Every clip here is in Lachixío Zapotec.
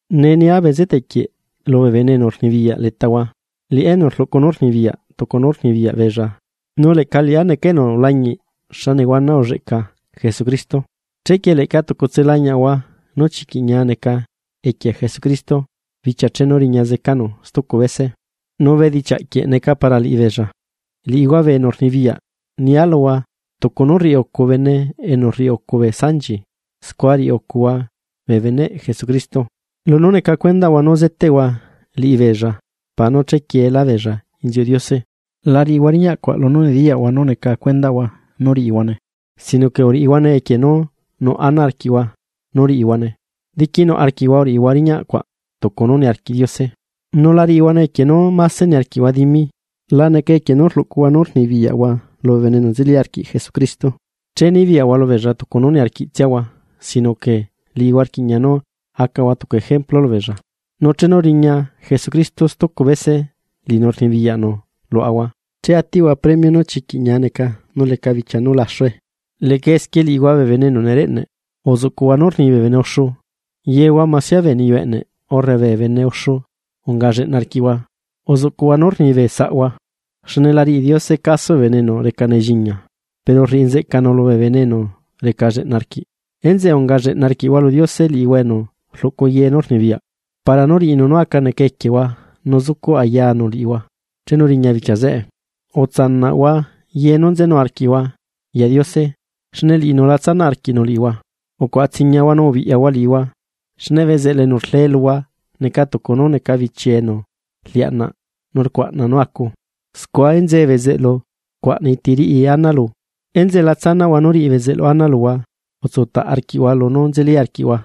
Nee nia bezeteꞌ quie lubee bene enu rnibiyaꞌ letahua, liꞌá enu rluꞌcu nú rnibiyaꞌ tucu nú rnibiyaꞌ beella, nu leꞌca liꞌá neca enu ulañiꞌ xa nehuana ulleꞌca Jesucristo. Chequie leꞌca tucutse lañiaꞌahua nú chiquiꞌ ñia neca equie Jesucristo bichia chenu riña zecanu stucu bese, nu bedichiaꞌquieꞌ neca para liꞌibeella. Liꞌihua bee enu rnibiyaꞌ nia luhua tucu nú rriucu bene enu rriucu bee sanchi scua riꞌi ucuhua bee beneꞌ Jesucristo, lunú neca cuendaꞌhua nú zeteꞌhua liꞌibeella para nú chequieelá beella inziuꞌ Diose. La riꞌihua riñaꞌ cuaꞌ lunú nediyaꞌhua nú neca cuendaꞌhua nú riꞌihuane, sino que uriꞌihuane equie nú nuꞌ ana arquiꞌhua riꞌihuane, diquinuꞌ arquiꞌhua uriꞌihua riñaꞌ cuaꞌ tucu nú niarquiꞌ Diose, nu la riꞌihuane equie nú niarquiꞌhua dimi. La necane equie nú rluꞌcuhua nú rnibiyaꞌhua lubee bene enu nzeli arquiꞌ Jesucristo, nú nibiyaꞌhua lubeella tucu nú niarquiꞌ tsiahua sino que liꞌihua rquiꞌña nu acahua tucu ejemplu lubeella. Nu chenu riña Jesucristo stucu bese, liꞌinu enu rnibiyaꞌ luaꞌahua che atiꞌhua premio nú chiquiꞌ ñia neca nú leca bichia nú laxu. Leꞌca esquie liꞌihua bee bene enu nereꞌneꞌ, uzuꞌcuꞌhua nú rni bee bene uxu. Yehua masia bee niyu eꞌneꞌ urre bee bene uxu aca lleꞌna rquiꞌhua, uzuꞌcuꞌhua nú rni bee saꞌhua: Xne la riꞌi Diose caso bee bene enu reca nelliñia, pero rriꞌi nzeꞌcanu lubee bene enu reca lleꞌna arquiꞌ. Enzeꞌe aca lleꞌna arquiꞌhua lu Diose, liꞌihua enu rluꞌcu ye nú rnibiyaꞌ para nú riꞌinu nú aca neca equiehua nu zucuꞌ ayanu liꞌihua chenu riña bichia zeꞌe. Utsaꞌnahua ye nú nzenu arquiꞌhua lu Diose, xne liꞌinu la tsanaꞌ arquiꞌnu liꞌihua. Ucuaꞌa tsiñiahua nu ubiꞌyahua liꞌihua, xne bezeꞌlu enu rlee luhua neca tucu nú neca bichiee enu rliaꞌnaꞌ nu rcuaꞌna nú acu, scua enzee bezeꞌlu rcuaꞌnai ti riꞌi ana lu. Enzeꞌe la tsanaꞌhua nu riꞌi bezeꞌlu ana luhua utsutaꞌ arquiꞌhua lunú nzeli arquiꞌhua,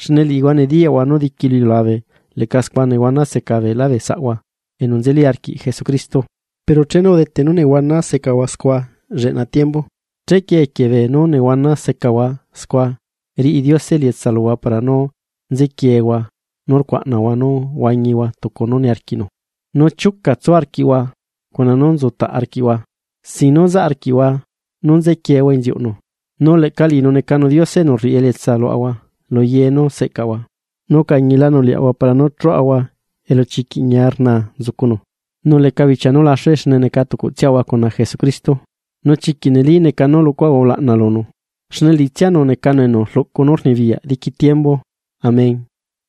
xne liꞌihua nediyaꞌhua nú diqui lu iliulabe leꞌca scua nehuana seca beelá bee saꞌhua enu nzeli arquiꞌ Jesucristo. Pero chenu udete nu nehuana secahua scua lleꞌna tiembu, chequie equie beenú nehuana secahua scua riꞌi Diose elietsa luhua para nú nzequieehua nu rcuaꞌnahua nú huañihua tucu nú niarquiꞌnu, nu chiuca tsu arquiꞌhua cuna nú tsutaꞌ arquiꞌhua, sin nú zaꞌ arquiꞌhua chequiehua inziuꞌnu, nu leꞌca liꞌinu necanu Diose enu rriꞌi elietsa luaꞌahua lu ye nú seꞌcaꞌahua, nu ucañilanu liaꞌahua para nú chuꞌuhua elu chiquiꞌ ñia rnaa nzucunu nu leca bichia nú laxue xne neca tucutsiaꞌahua cuna Jesucristo. Nu chiquiꞌ neli neca nú luꞌcuaꞌahua ulaꞌna lunu, xne liꞌitsianu necanu enu rluꞌcu nú rnibiyaꞌ diqui tiembu. Amén.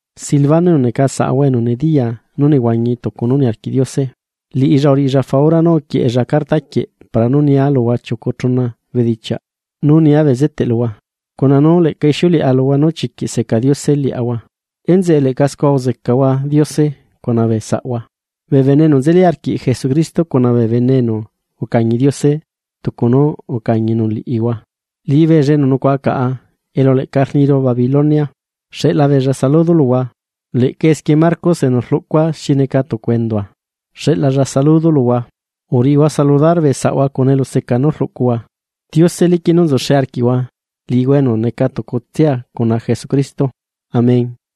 Silvano enu neca saꞌahua enu nediyaa nú nehuañi tucu nú niarquiꞌ Diose, liꞌilla uriꞌilla faura nú uquieꞌella carta quieꞌ para nú nia luhua chiucu chuna bedichiaꞌ nu nia bezeteꞌ luhua, cuna nú leꞌca ixiuleꞌa luhua nú chiquiꞌ seca Diose liaꞌahua. Enzeꞌe leꞌca scua uzecahua Diose cuna bee saꞌhua. Bee bene enu nzeli arquiꞌ Jesucristo cuna bee bene enu ucañi Diose tucu nú ucañinu liꞌihua, liꞌibeella enu nucuaꞌa caꞌa elu leꞌca rniru Babilonia, xeꞌla beella saludo luhua, leꞌca esquie Marcos enu rlucua xi neca tucu endua, xeꞌlalla saludo luhua. Uriꞌihua saludar bee saꞌhua cuna eluseca nú rluꞌcuhua. Diose liquiꞌ nú nzuxe arquiꞌhua, liꞌihua enu neca tucutsia cuna Jesucristo. Amén.